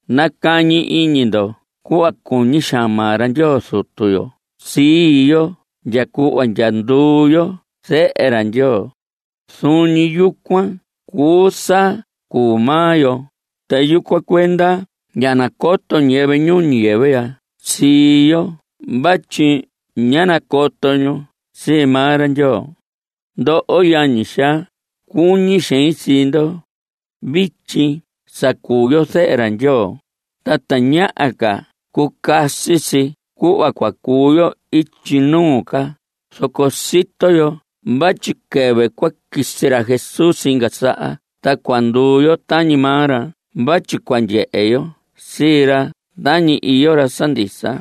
Nacañi iñi ndo cuhva cuñi xaan maa ra Ndyoo Zutu yo sii yo ndya cuhva ndya nduu yo zehe ra Ndyoo. Zuun ñi yucuan cuu sa cuu maa yo, ta yucuan cuenda ña nacoto ñiyɨvɨ ñuu ñiyɨvɨ ya sii yo vatyi ña nacoto ñu sii maa ra Ndyoo. Ndoho yañi xaa, cuñi xein sii ndo. Vityi sa cuu yo zehe ra Ndyoo, ta tañaha ca cucasi si cuhva cua cuu yo ityi nuu ca. Zoco sito yo vatyi quɨvɨ cua quisi ra Jesús inga saha ta cua nduu yo tañi maa ra vatyi cua ndyehe yo sii ra tañi iyo ra sa ndisa.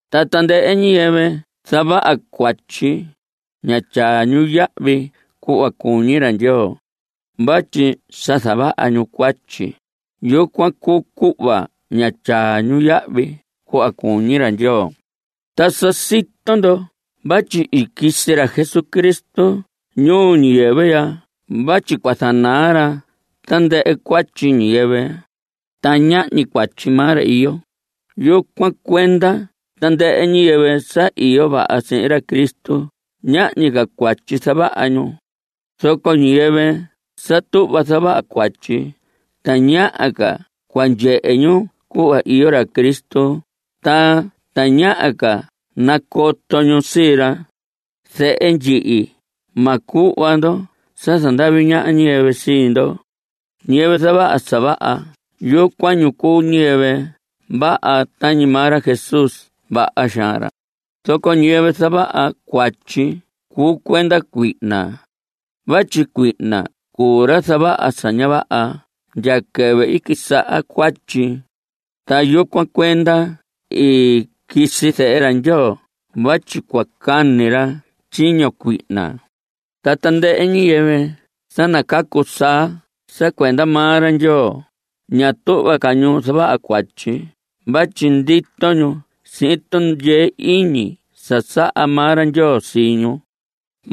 Ta tandɨhɨ ñiyɨvɨ zavaha cuatyi, ña tyaa ñu yahvi cuhva cuñi ra Ndyoo. Vatyi sa zavaha ñu cuatyi, yucuan cuu cuhva ña tyaa ñu yahvi cuhva cuñi ra Ndyoo. Ta sa sito ndo vatyi i quisi ra Jesucristo ñuu ñiyɨvɨ ya vatyi cua zanaa ra tandɨhɨ cuatyi ñiyɨvɨ. Ta ñahñi cuatyi maa ra iyo. Yucuan cuenda tandɨhɨ ñiyɨvɨ sa iyo vaha sihin ra Cristo, ñahñi ca cuatyi zavaha ñu. Zoco ñiyɨvɨ sa tuhva zavaha cuatyi, tañaha ca cua ndyehe ñu cuhva iyo ra Cristo, ta tañaha ca nacoto ñu sii ra. Zehe ndyihi, ma cuhva ndo sa zandavi ñaha ñiyɨvɨ sii ndo. Ñiyɨvɨ zavaha sa vaha, yucuan ñu cuu ñiyɨvɨ vaha tañi maa ra Jesús vaha xaan ra. Zoco ñiyɨvɨ zavaha cuatyi cuu cuenda cuihna. Vatyi cuihna cuu ra zavaha sa ña vaha ndya quɨvɨ i quisaha cuatyi. Ta yucuan cuenda i quisi Zehe ra Ndyoo vatyi cua cani ra tyiño cuihna. Ta tandɨhɨ ñiyɨvɨ sa nacacu saa sa cuenda maa ra Ndyoo, ña tuhva ca ñu zavaha cuatyi vatyi ndito ñu sihin tundyee iñi sa saha maa ra Ndyoo sii ñu.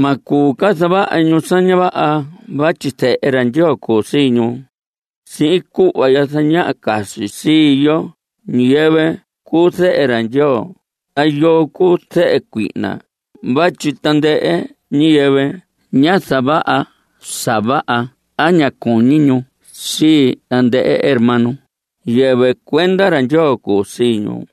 Ma cuu ca zavaha ñu sa ña vaha vatyi zehe ra Ndyoo cuu sii ñu. Sihin cuhva ya zañaha casi si yoo ñiyɨvɨ cuu zehe ra Ndyoo ta yoo cuu zehe cuihna vatyi tandɨhɨ ñiyɨvɨ ña zavaha sa vaha a ña cuñi ñu sii tandɨhɨ hermano, yɨvɨ cuenda ra Ndyoo cuu sii ñu.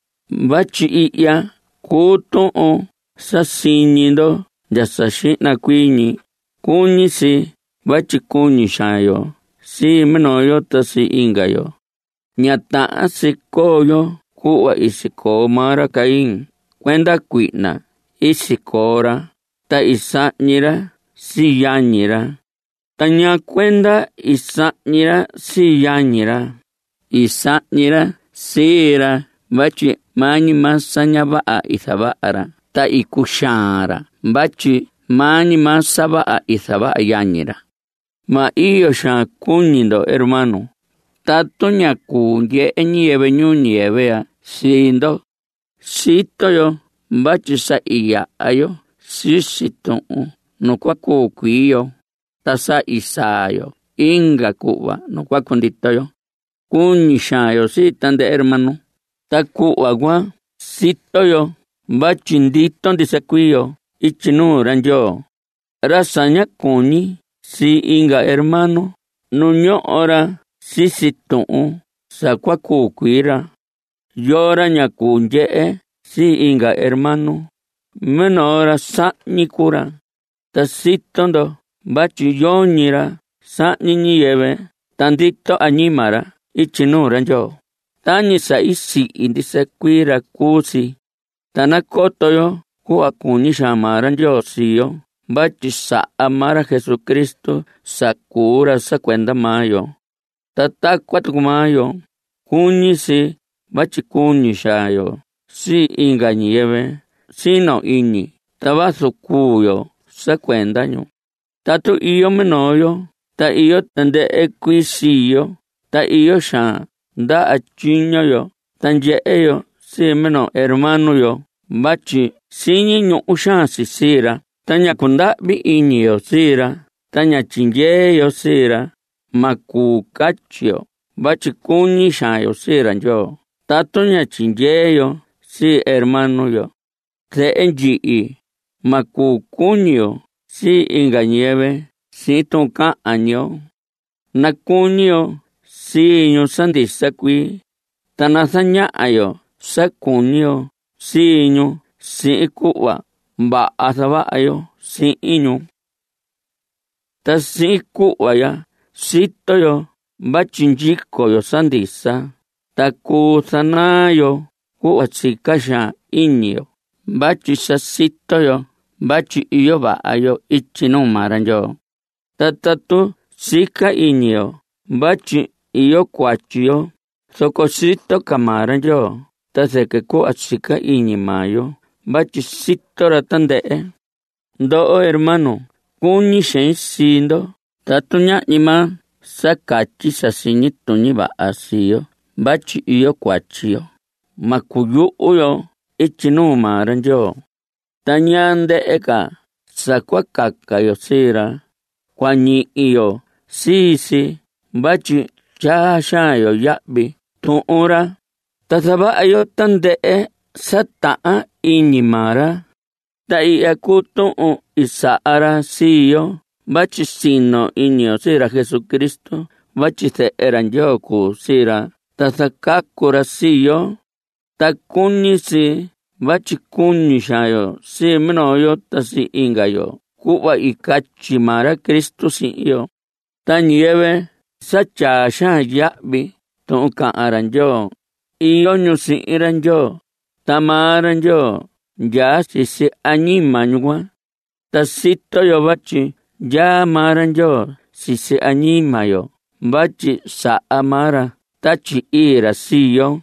Vatyi ihya cuu tuhun sa siñi ndo ndya sa xihna cuii ñi: Cuñi si vatyi cuñi xaan yo sii minoo yo ta sii inga yo. Ña tahan si coo yo cuhva i sicoo maa ra Caín. Cuenda cuihna i sicoo ra, ta i sahñi ra sii yañi ra. ¿Ta ñaa cuenda i sahñi ra sii yañi ra? I sahñi ra sii ra vatyi maa ñi maa sa ña vaha i zavaha ra, ta i cuxaan ra vatyi maa ñi maa sa vaha i zavaha yañi ra. Ma iyo xaan cuñi ndo, hermano, tatu ña cuu ndyehe ñiyɨvɨ ñuu ñiyɨvɨ ya sii ndo. Sito yo vatyi sa i yaha yo sisi tuhun nu cua cuu cuii yo, ta sa i saa yo inga cuhva nu cua cundito yo. Cuñi xaan yo sii tandɨhɨ hermano. Ta cuhva cuan sito yo vatyi ndito ndisa cuii yo ityi nuu ra Ndyoo. Ra sa ña cuñi sii inga hermano, nu ñoho ra sisi tuhun sa cua cuu cuii ra. Yoo ra ña cuu ndyehe sii inga hermano, minoo ra sahñi cuu ra. Ta sito ndo vatyi yoñi ra sahñi ñiyɨvɨ ta ndito añima ra ityi nuu ra Ndyoo. Tañi sa i sihi ndisa cuii ra cuu si. Ta nacoto yo cuhva cuñi xaan maa ra Ndyoo sii yo vatyi saha maa ra Jesucristo sa cuu ra sa cuenda maa yo. Ta tacuan tucu maa yo, cuñi si vatyi cuñi xaan yo sii inga ñiyɨvɨ sino iñi ta vazu cuu yo sa cuenda ñu. Tatu iyo minoo yo ta iyo tandɨhɨ cuii sii yo ta iyo xaan ndaha tyiño yo ta ndyehe yo sii minoo hermano yo vatyi siñi ñuhu xaan si sii ra ta ña cundahvi iñi yo sii ra ta ña tyindyee yo sii ra, ma cuu catyi yo vatyi cuñi xaan yo sii ra Ndyoo tatu ña tyindyee yo sii hermano yo. Zehe ndyihi, ma cuu cuñi yo sii inga ñiyɨvɨ sihin tuhun cahan ñi yo. Nacuñi yo sii ñu sa ndisa cuii, ta nazañaha yo sa cuñi yo sii ñu sihin cuhva vaha zavaha yo sihin ñu. Ta sihin cuhva ya, sito yo vatyi ndyico yo sa ndisa, ta cuu zanaa yo cuhva sica xaan iñi yo vatyi sa sito yo vatyi iyo vaha yo ityi nuu maa ra Ndyoo. Ta tatu sica iñi yo vatyi iyo cuatyi yo, zoco sito ca maa ra Ndyoo ta zɨquɨ cuhva sica iñi maa yo vatyi sito ra tandɨhɨ. Ndoho hermanos, cuñi xein sii ndo. Tatu ñahñi maa sa catyi sa siñi tuñi vaha sii yo vatyi iyo cuatyi yo, ma cuyuhu yo ityi nuu maa ra Ndyoo. Ta ñaa ndɨhɨ ca sa cua caca yo sii ra, cua ñihi yo sii si vatyi tyaa xaan yo yahvi tuhun ra, ta zavaha yo tandɨhɨ sa tahan iñi maa ra. Ta ihya cuu tuhun i saha ra sii yo vatyi sino iñi yo sii ra Jesucristo vatyi zehe ra Ndyoo cuu sii ra ta zacacu ra sii yo. Ta cuñi si vatyi cuñi xaan yo sii minoo yo ta sii inga yo cuhva i catyi maa ra Cristo sihin yo. Ta ñiyɨvɨ sa tyaa xaan yahvi tuhun cahan ra Ndyoo, iyo ñu sihin ra Ndyoo, ta maa ra Ndyoo ndyaa sisi añima ñu cuan. Ta sito yo vatyi ndyaa maa ra Ndyoo sisi añima yo vatyi saha maa ra Tatyi Ii ra sii yo.